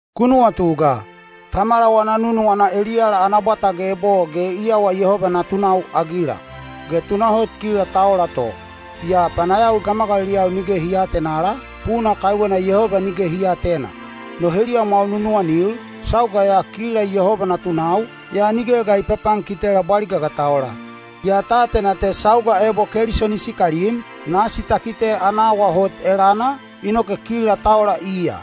Ku nuwatu ga! Tamala wana nunuwana eliyala ana bwata geb o ge i awa Yehoba natunau-agila. Ge tunahot kila ta ola to. Yaa panayawi gamagaliliyau nige hi aatenala, puna kaiwena Yehoba nige hi aatena. No heliyamwau nunuwanil, sauga ya kila Yehoba natunau, yaa nige ga i papankitela bwaliga ga ta ola. Yaa ta atena te sauga ebo Keliso ni sikalim, nasi ta kite ana awa hot elana, inoke kila ta ola iya.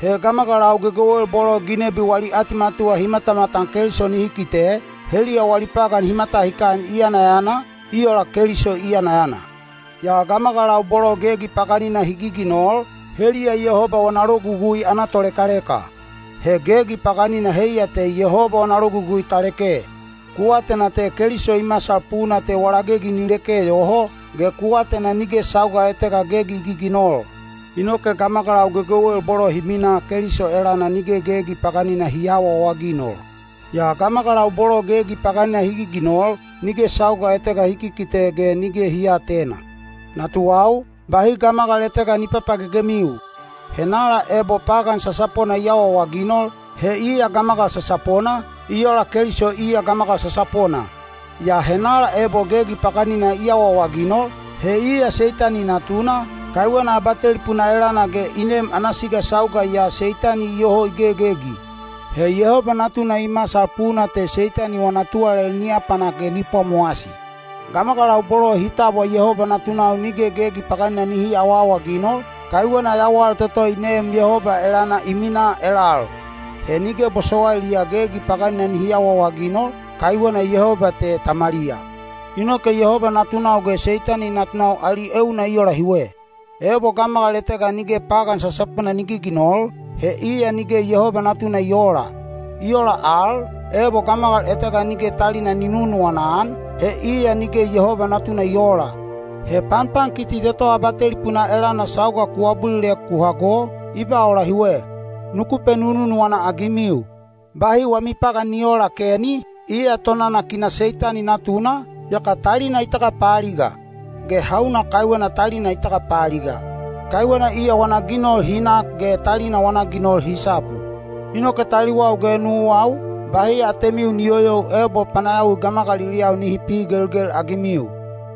He gamagalau gegewel bolo ginebi wali atimatuwa hi matamatan Keliso nihi kite, heliya wali pagan hi matahikan i yanayana, i ola Keliso i yanayana. Yaa gamagalau bolo gegi paganina hi giginol, heliya Yehoba wana logugui ana tolekaleka. He gegi paganina heiya te Yehoba wana logugui ta leke. Ku atena te Keliso i masal puna te wala gegi ni leke yoho, ge ku atena nige sauga etega gegi i giginol. Inoke gamagalau gegewel bolo hi minaa Keliso elana nige gegi paganina hi aawaawaginol. Yaa gamagalau bolo gegi paganina hi giginol, nige sauga etega hi kikite ge nige hi aatena. Natuwau, bahi gamagal etega ni papagegemiu. Henala ebo pagan sasapona i awaawaginol, he iya gamagal sasapona, i ola Keliso iya gamagal sasapona. Yaa henala ebo gegi paganina i awaawaginol, he iya Seitani natuna, kaiwena abatelipuna elana ge i nem ana siga sauga ya Seitani iyoho i gegegi. He Yehoba Natuna i masal puna te Seitani wana tuwalali ni apanak ge ni pwamowasi. Gamagalau bolo hi tabwa Yehoba natunau nige gegi paganina nihi aawaawaginol, kaiwena yawal toto i neem Yehoba elana i minaa elal. He nige bosowailiya gegi paganina nihi awaawaginol, kaiwena Yehoba te Tamaliya. Inoke Yehoba natunau ge Seitani natunau ali euna i ola hiwe: ebo gamagal etega nige pagan sasapona ni giginol, he iya nige Yehoba natuna i oola. I ola al, ebo gamagal etega nige talina ni nununuwana-an, he iya nige Yehoba natuna i oola. He panpankiti toto abatelipuna elana sauga ku abulilek ku hago, i ba ola hiwe: nuku penununuwana-agimiu. Bahi wami pagan ni oola Keni, iya tonanakina Seitani natuna, yaka talina i tagapaaliga. Ge hauna kaiwena talina i tagapaaliga? Kaiwena iya wana ginol hi nak ge talina wana ginol hi sapu. Inoke taliwau ge nuwau, bahi atemiu ni yoyou ebo panayawi gamagaliliyau nihi pihigelgel-agimiu.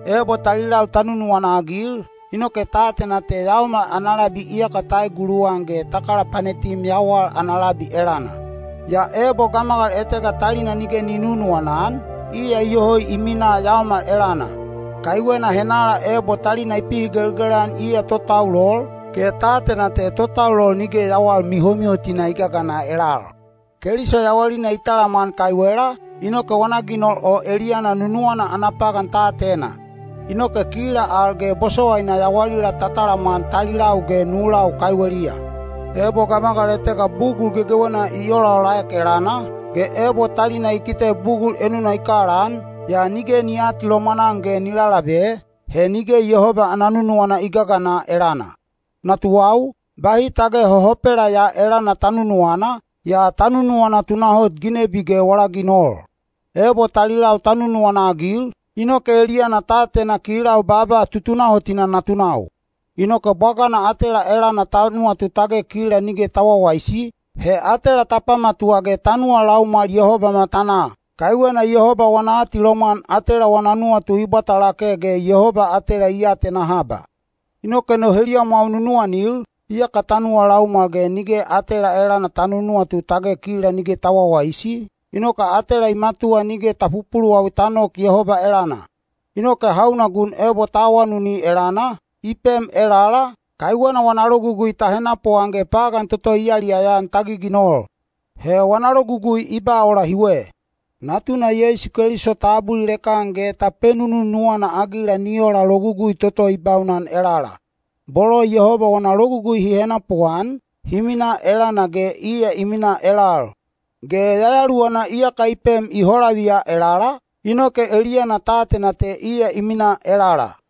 Ebo talilau ta nunuwana-agil, inoke ta atena te yaomal ana labi iyaka ta eguluwan ge ta kalapanetim yawal ana labi elana. Yaa ebo gamagal etega talina nige i nunuwana-an, iya iyoho i minaa yaomal elana. Kaiwena henala ebo talina i pihigelgel-an iya totaulol, ge ta atena te totaulol nige yawal mihomihotina i gagana elal. Keliso yawalina i talamwan kaiwela, inoke wana ginol o eliyana nunuwana ana pagan ta atena. Inoke kila al ge bosowaina yawalila ta talamwan talilau ge nulau kaiweliya. Ebo gamagal etega bugul gegewena i olaolaek elana, ge ebo talina i kite bugul enuna i kalaan, yaa nige ni aatilomwan-an ge ni lalabe, he nige Yehoba ana nunuwana i gagana elana. Natuwau, bahi tage hohopela ya elana ta nunuwana, yaa ta nunuwana tunahot ginebi ge wala ginol. Ebo talilau ta nunuwana-agil, inoke eliyana ta atena kilau baaba tutunahotina natunau. Inoke bwagana atela elana ta nuwatu tage kila nige ta wawaisi, he atela ta pamatuwa ge ta nuwa laumwal Yehoba matanaa. Kaiwena Yehoba wana atilomwan atela wana nuwatu i bwata lake ge Yehoba atela i atena haba. Inoke no heliyamwau nunuwanil, iyaka ta nuwa laumwal ge nige atela elana ta nunuwatu tage kila nige ta wawaisi, inoke atela i matuwa nige ta pupuluwawi ta nok Yehoba elana. Inoke hauna gun ebo ta awanuni elana, i pem elala, kaiwena wana logugui ta henapuan ge pagan toto i yaliyaya-an ta giginol. He wana logugui i ba ola hiwe: Natuna Yeisu Keliso ta abulilek-an ge ta penununuwana-agila ni ola logugui toto i baunan elala. Bolo Yehoba wana logugui hi henapuan, hi minaa elana ge iya i minaa elal. Ge Yayaluwana iyaka i pem i holaviya elala, inoke eliyana ta atena te iya i minaa elala.